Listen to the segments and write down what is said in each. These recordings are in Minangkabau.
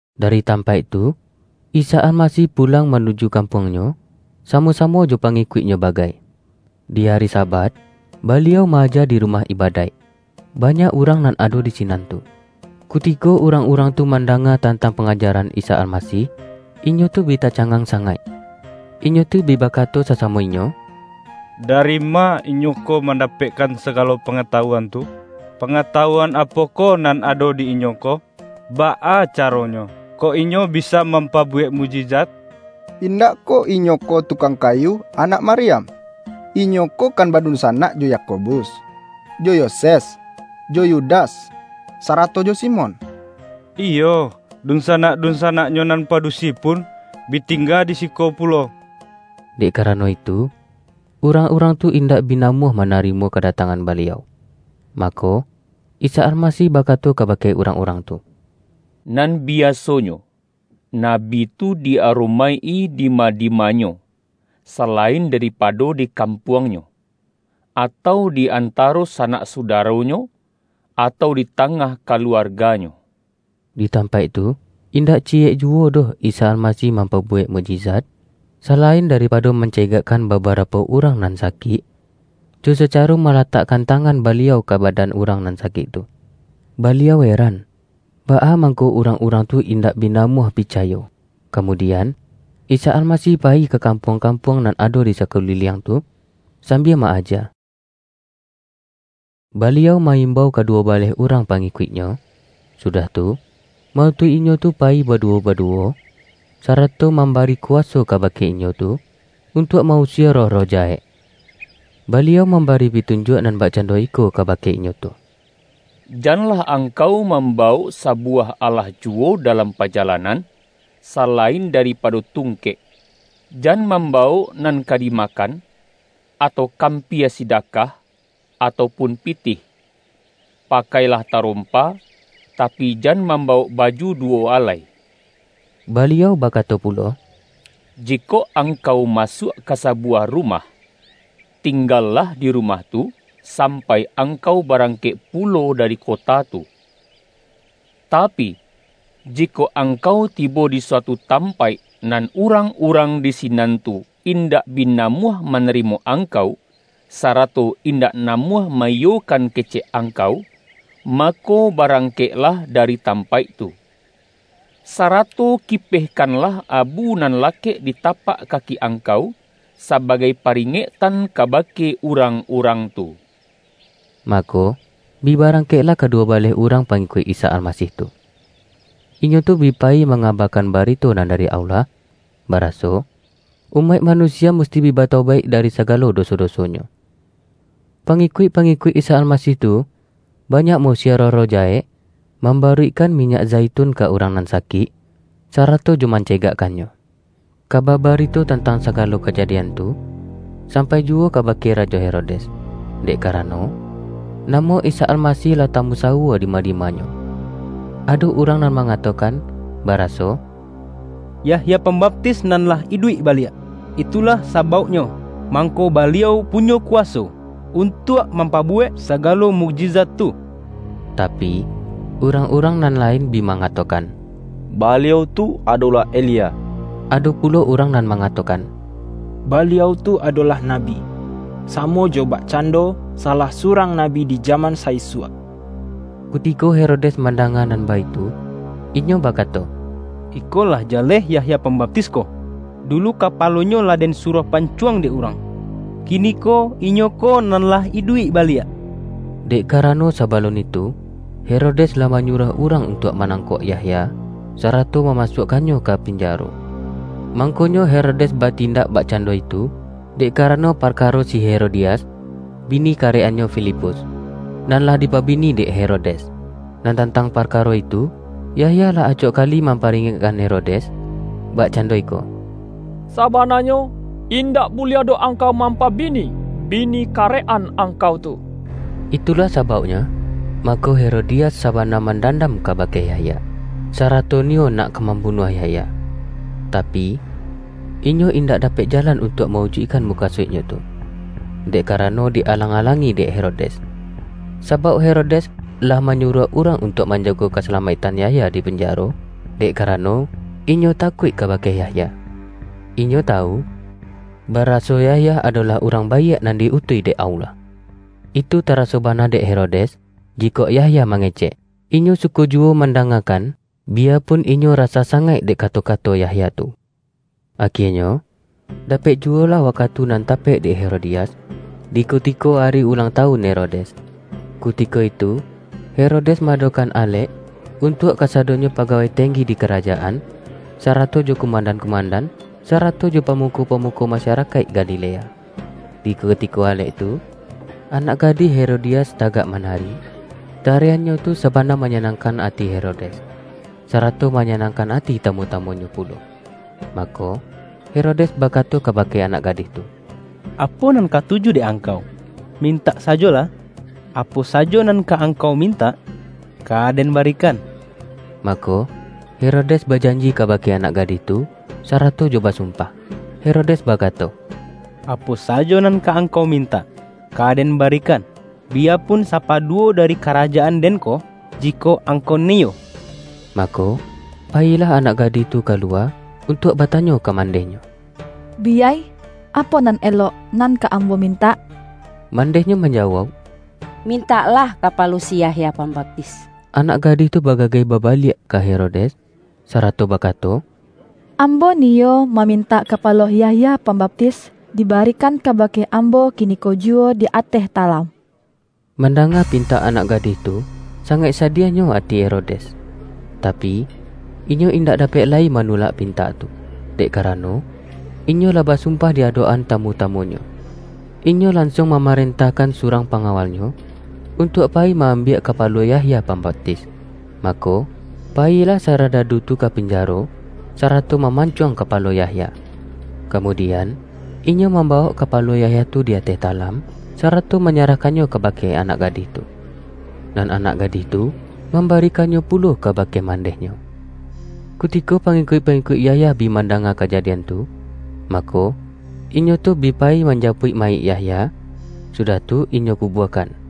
Dari tampaik tu, Isa Almasih pu-lang manuju kampuang-Nyo, samo-samo jo pangikuik-Nyo bagai. Di ari Sabat, Baliau ma-aja di rumah iba-daik. Banyak urang nan ado di sinan tu. Kutiko urang-urang tu mandanga tantang pangajaran Isa Almasih, inyo tu bi tacangang sangaik. Inyo tu bi ba-kato sasamo inyo,”Dari ma Inyo ko mandapekkan sagalo pangatawuan tu? Pangatawuan apokoh nan ado di Inyo ko? Baa caronyo, kok Inyo bisa mam-pabuwek mukjizat? Indak koh Inyo ko tukang kayu, anak Maryam, Inyo ko kan badunsanak jo Yakobus, jo Yoses, jo Yudas sarato jo Simon? Iyo, dunsa-nak-dunsanak-Nyo nan padusi pun bi tingga di siko pulo.” Dek karano itu, urang-urang tu indak bi namuah ma-narimo kadatangan Baliau. Mako, Isa Almasih bakato kabake urang-urang tu,”Nan biasonyo, nabi tu di aromaik-i dima-dimanyo, sala-in daripado di kampuangnyo, atau di antaro sanak sudaronyo atau di ta-ngah kaluarganyo.” Di tampaik tu, indak ciyek juwo doh Isa Almasih mampabuwek muk-jizat, salain daripado mancegakkan babarapo urang nan sakik, jo sacaro malatakkan tangan Baliau ka badan urang nan sakik tu. Baliau eran, baa mangko urang-urang tu indak bi na-muah picayo. Kamudian, Isa Almasih payi ka kampuang-kampuang nan ado di sa-kuliliang tu, sambia ma-aja. Baliau ma-imbau kaduwo baleh urang pangi-kuik-Nyo, sudah tu, ma-utuih inyo tu payi baduwo-baduwo, sarato mamba-ri kuwaso kabake inyo tu, untuak ma-usie roh-roh jahek. Baliau mambari pitunjuak nan bakcando iko kabake inyo tu,”Janlah angkau mambawok sabuwah alah juwo dalam pajalanan, salain daripado tungkek. Jan mam-bawok nan ka dimakan, atau kam-pia sidakah, atau pun pitih. Pakailah tarompa, tapi, jan mambawok baju duwo alai.” Baliau bakato pulo,”Jikok angkau masuak ka sabuwah rumah, tinggalah di rumah tu, sampai angkau barangkek pulo dari kota tu. Tapi, jikok angkau tibo di suatu tampaik, nan urang-urang di sinan tu indak bi namuah manarimo angkau, sarato in-dak namuah ma-iyokan kecek angkau, mako, barangkeklah dari tampaik tu. Sarato kipehkanlah abu nan lakek di tapak kaki angkau, sabagai paringek-tan kabake urang-urang tu!” Mako, bi barangkeklah kaduwo baleh urang pangikuik Isa Almasih tu. Inyo tu bi payi mangabakan barito nan dari Allah, baraso, umaik manu-sia musti bi batobaik dari sagalo do-so-dosonyo. Pangikuik-pangikuik Isa Almasih tu, banyak ma-usie roh-roh jahek, mambaruikkan minyak zaitun ka urang nan sakik, sarato jo mance-gakkannyo. Kaba barito tantang sagalo kaja-dian tu, sampai juwo kabake Rajo He-rodes, dek karano, namo Isa Almasih lah tamusawua dima-dimanyo. Ado urang nan mangatokan, baraso”Yahya Pambaptis nan lah iduik baliak! Itu-lah sabauknyo, mangko Baliau punyo kuwaso untuak mampabuwek sagalo mukjizat tu.” Tapi, urang-urang nan lain bi ma-ngatokan,”Baliau tu adolah Elia.” Ado pulo urang nan mangatokan,”Baliau tu adolah nabi, samo jo bak-cando salah surang nabi di jaman sa-isuak.” Kutiko Herodes mandanga nan baitu, inyo bakato,”Iko lah jaleh Yahya Pambaptis ko, dulu, kapalonyo lah den suruah pancuang dek urang. Kiniko, inyo ko nan lah iduik baliak!” Dek karano sabalun itu, Herodes lah manyuruah urang untuak manangkok Yahya, sarato mamasuakkannyo ka pinjaro. Mangkonyo Herodes batin-dak bakcando itu, dek karano parkaro si Herodias, bini karek-annyo Filipus, nan lah dipabini dek Herodes, nan tantang parkaro itu, Yahya lah acok kali mamparingekkan Herodes, bak-cando iko,”Sabananyo, indak buliah doh angkau mampabini, bini karek-an angkau tu!” Itulah sabauknyo, mangko Herodi-as sabana mandandam kabake Yahya, sarato niyo nak ka mambunuah Yah-ya, tapi, inyo indak dapek jalan un-tuak ma-ujuikkan mukasuiknyo tu, dek karano di-alang-alangi dek He-rodes. Sabauk Herodes lah manyu-ruah urang untuak manjago kasala-maiktan Yahya di pinjaro, dek karano inyo takuik kabake Yahya. Inyo tawu, baraso Yahya adolah urang baiak nan di-utuih dek Allah. Itu taraso bana dek Herodes, jikok Yahya mangecek, inyo suko juwo mandangakan, biya-pun inyo rasah sangaik dek kato-ka-to Yahya tu. Akienyo, dapek juwolah wakatu nan tapek dek Herodias, di kutiko ari ulang tawun Herodes. Kutiko itu He-rodes ma-adokan alek, untuak kasado-nyo pagawai tenggi di karajaan, sara-to jo kumandan-kumandan, sarato jo pamuko-pamuko masarakaik Galilea. Di kutiko alek tu, anak gadih Hero-dias tagak manari, tariannyo tu saba-na manyanangkan ati Herodes, sarato manyanangkan ati tamu-tamunyo pu-lo. Mako, Herodes bakato kabake anak gadih tu,”Apo nan katuju dek angkau, mintak sajolah. Apo sajo nan ka ang-kau mintak, ka den barikan!” Mako, Herodes bajanji kabake anak gadih tu, sarato jo basumpah. Herodes bakato,”Apo sajo nan ka angkau mintak, ka den barikan, biyapun, sapaduwo dari kara-jaan den ko, jikok angkau niyo!” Mako, payilah anak gadih tu ka-luwa, untuak batanyo ka mandehnyo,”Biyai, apo nan elok nan ka ambo min-tak?” Mandehnyo manjawauk,”Mintaklah kapalo si Yahya Pambaptis.” Anak gadih tu bagageh babaliak ka Herodes, sarato bakato,”Ambo ni-yo mamintak kapalo Yahya Pambap-tis, dibarikan kabake ambo kiniko ju-wo di ateh talam!” Mandanga pintak anak gadih tu, sangaik sadiahnyo ati Herodes. Tapi, inyo indak dapek lai manulak pintak tu, dek karano, inyo lah basumpah di adok-an tamu-tamunyo. Inyo lan-suang mamarentahkan surang panga-walnyo, untuak payi ma-ambiak ka-palo Yahya Pambaptis. Mako, payilah saradadu tu ka pinjaro, sarato maman-cuang kapalo Yahya. Kamudian, inyo mambawok kapalo Yahya tu di ateh talam, sarato manyarahkannyo kabake anak gadih tu. Nan anak gadih tu, mambarikannyo pulo kabake man-dehnyo. Kutiko pangikuik-pangikuik Yahya bi mandanga kajadian tu, ma-ko, inyo tu bi payi manjapuik mayik Yahya, sudah tu inyo kubuakan.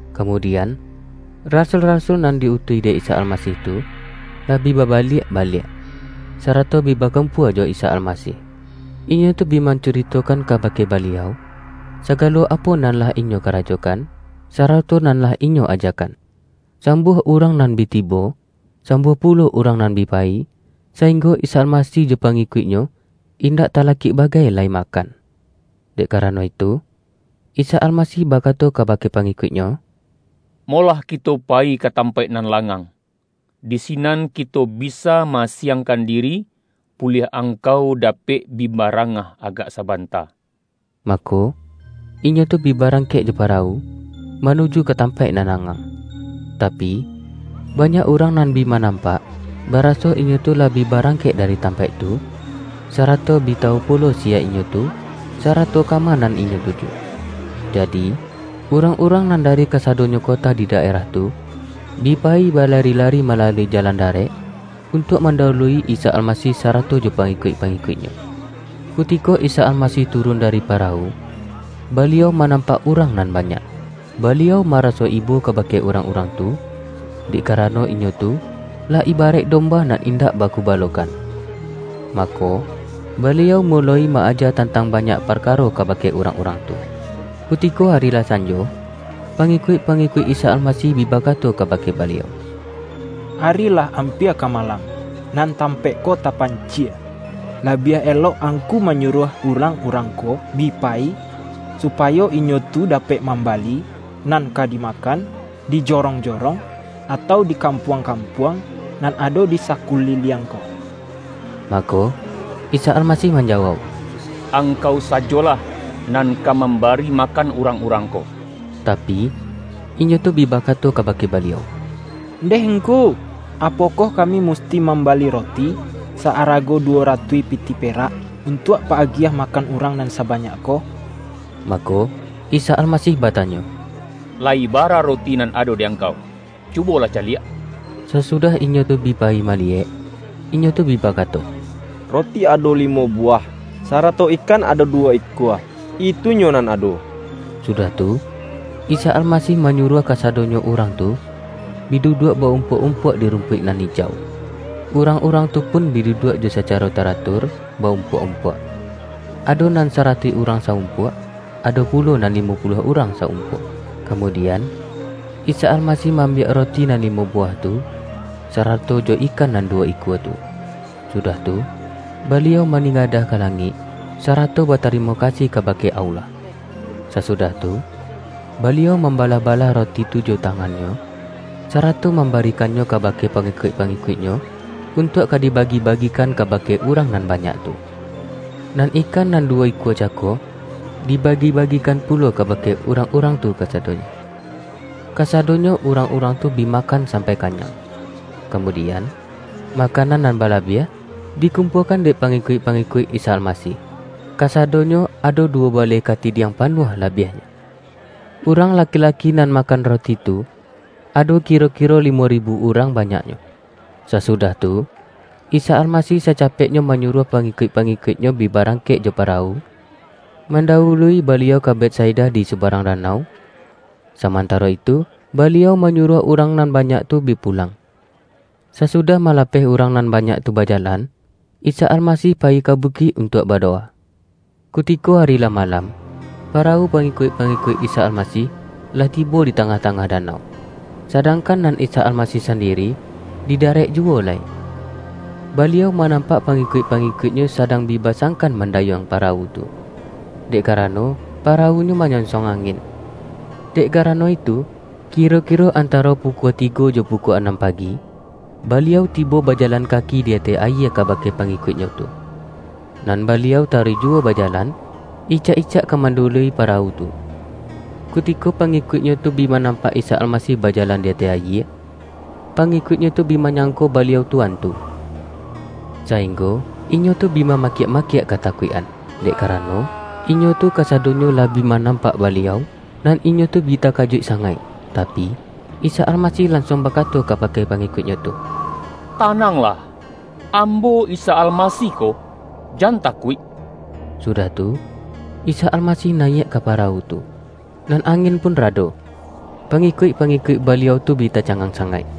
Kamudian, rasul-rasul nan di-utuih dek Isa Almasih tu, lah bi ba-baliak baliak, sarato bi bakumpua jo Isa Almasih. Inyo tu bi mancuritokan kabake Baliau, sagalo apo nan lah inyo karajokan, sarato nan lah inyo ajakan. Sambuah urang nan bi tibo, sam-buah pulo urang nan bi payi, sainggo Isa Almasih jo pangikuik-Nyo, indak talakik bagai lai makan. Dek karano itu, Isa Almasih bakato kabake pangi-kuik-Nyo,”Molah kito payi ka tampaik nan langang, di sinan kito bisa ma-asiangkan diri, buliah angkau dapek bi barangah agak sabanta.” Mako, inyo tu bi barangkek jo parawu, ma-nuju ka tampaik nan langang. Tapi, banyak urang nan bi ma-nampak, baraso inyo tu lah bi barang-kek dari tampaik tu, sarato bi tawu pulo siya inyo tu, sarato kama nan inyo tuju. Jadi, urang-urang nan da-ri kasadonyo kota di daerah tu, bi pa-yi balari-lari malalui jalan darek, un-tuak mandawului Isa Almasih sarato jo pangikuik-pangikuik-Nyo. Ku-tiko Isa Almasih turun dari parawu, Baliau manampak urang nan banyak. Baliau maraso ibo kabake urang-urang tu, dek karano inyo tu, lah ibaraik domba nan indak bagubalokan. Ma-ko, Baliau muloi ma-aja tantang ba-nyak parkaro kabake urang-urang tu. Kutiko ari lah sanjo, pangikuik-pa-ngikuik Isa Almasih bi bakato kabake Baliau,”Ari lah ampia ka malam, nan tampaik ko tapancie. Labiah elok Angku manyuruah urang-urang ko bi payi, supayo inyo tu dapek mamba-li nan ka dimakan, di jorong-jorong, atau di kampuang-kampuang nan ado di sakuliliang ko.” Mako, Isa Almasih manjawauk,”Angkau sajolah, nan ka mambari ma-kan urang-urang ko.” Tapi, inyo tu bi bakato kabake Baliau,”Ndeh Ngku, apokoh kami mus-ti mambali roti sa-arago duwo ratuih pitih perak, untuak pa-agiah makan urang nan sabanyak ko?” Mako, Isa Almasih batanyo,”La-yi bara roti nan ado di angkau? Cu-bolah caliak.” Sasudah inyo tu bi payi maliyek, inyo tu bi bakato,”Roti ado limo bu-wah, sarato ikan ado duwo ikua, itu-nyo nan ado.” Sudah tu, Isa Almasih manyuruah kasadonyo urang tu, bi duduak ba-um-puak-umpuak di rumpuik nan ijau. Urang-urang tu pun bi duduak jo sacaro taratur, ba-umpuak-umpuak. Ado nan saratuih urang sa-umpuak, ado pulo nan limo puluah urang sa-umpuak. Kamudian, Isa Almasih ma-ambiak roti nan limo buwah tu, sarato jo ikan nan duwo ikua tu, su-dah tu, Baliau maningadah ka langik, sarato batarimo kasih kabake Allah. Sasudah tu, Baliau mambalah-balah roti tu jo tangan-Nyo, sarato mamba-rikannyo kabake pangikuik-pangikuik-Nyo, untuak ka dibagi-bagikan kabake urang nan banyak tu. Nan ikan nan duwo ikua cako, dibagi-bagikan pu-lo kabake urang-urang tu kasadonyo. Kasadonyo urang-urang tu bi ma-kan sampai kanyang. Kamudian, makanan nan balabiah, dikumpuakan dek pangikuik-pangikuik Isa Almasih — kasadonyo ado duwo baleh katidiang panuah, labiahnyo. Urang laki-laki nan makan roti itu, ado kiro-kiro li-mo ribu urang banyaknyo. Sasudah tu, Isa Almasih sacapek-nyo manyuruah pangikuik-pangikuik-Nyo bi barangkek jo parawu, manda-wului Baliau ka Betsaida di subarang danau, samantaro itu Baliau manyu-ruah urang nan banyak tu bi pulang. Sasudah malapeh urang nan banyak tu bajalan, Isa Almasih payi ka bukik untuak badowa. Kutiko ari lah ma-lam, parawu pangikuik-pangikuik Isa Almasih, lah tibo di tangah-tangah da-nau, sadangkan nan Isa Almasih sandi-ri, di darek juwo lai. Baliau manam-pak pangikuik-pangikuik-Nyo sadang bi basangkan mandayuang parawu tu, dek karano parawunyo manyonsong angin. Dek karano itu, kiro-kiro antaro pu-kua tigo jo pukua anam pagi, Baliau ti-bo bajalan kaki di ateh ayie kabake pa-ngikuik-Nyo tu. Nan Baliau taruih juwo bajalan, icak-icak ka mandawului pa-rawu tu. Kutiko pangikuik-Nyo tu bi manampak Isa Almasih bajalan di ateh ayie, pangikuik-Nyo tu bi manyangko Baliau tu antu, sainggo inyo tu bi ma-makiak-makiak katakuik-an. Dek kara-no, inyo tu kasadonyo lah bi manampak Baliau, nan inyo tu bi takajuik sangaik Tapi, Isa Almasih lansuang bakato kabake pangikuik-Nyo tu,”Tananglah! Ambo Isa Almasih ko. Jan takuik!” Sudah tu, Isa Almasih nayiak ka parawu tu, nan angin pun rado. Pa-ngikuik-pangikuik Baliau tu bi taca-ngang sangaik.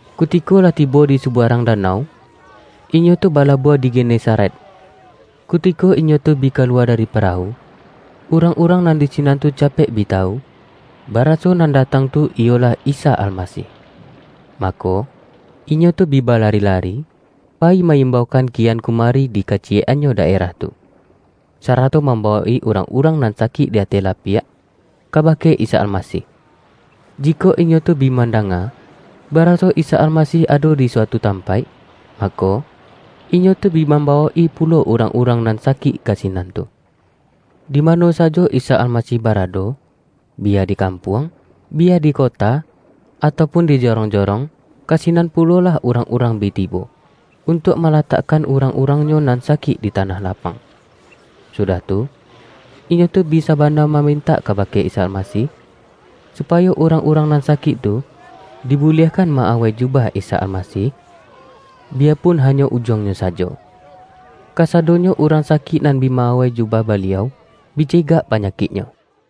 Kutiko lah tibo di subarang danau, inyo tu balabuah di Genesaret. Kutiko inyo tu bi kaluwa dari parawu, urang-urang nan di sinan tu capek bi tawu, baraso nan datang tu iyolah Isa Almasih. Mako, inyo tu bi balari-lari, payi ma-imbaukan kian kumari di kaciyek-annyo daerah tu, sarato mambawok-i urang-urang nan sakik di ateh lapiak, kabake Isa Almasih. Jikok inyo tu bi mandanga, baraso Isa Almasih ado di suatu tampaik, mako, inyo tu bi mam-bawok-i pulo urang-urang nan sakik ka sinan tu. Dimano sajo Isa Alma-sih barado—biya di kampuang, biya di kota, atau pun di jorong-jorong— ka sinan pulolah urang-urang bi tibo, untuak malatakkan urang-urangnyo nan sakik di tanah lapang. Sudah tu, inyo tu bi sabana mamintak kabake Isa Almasih, supayo urang-urang nan sakik tu, dibuliahkan ma-awai jubah Isa Almasih, biya pun hanyo ujuang-nyo sajo. Kasadonyo urang sakik nan bi ma-awai jubah Baliau, bi cegak pa-nyakiknyo.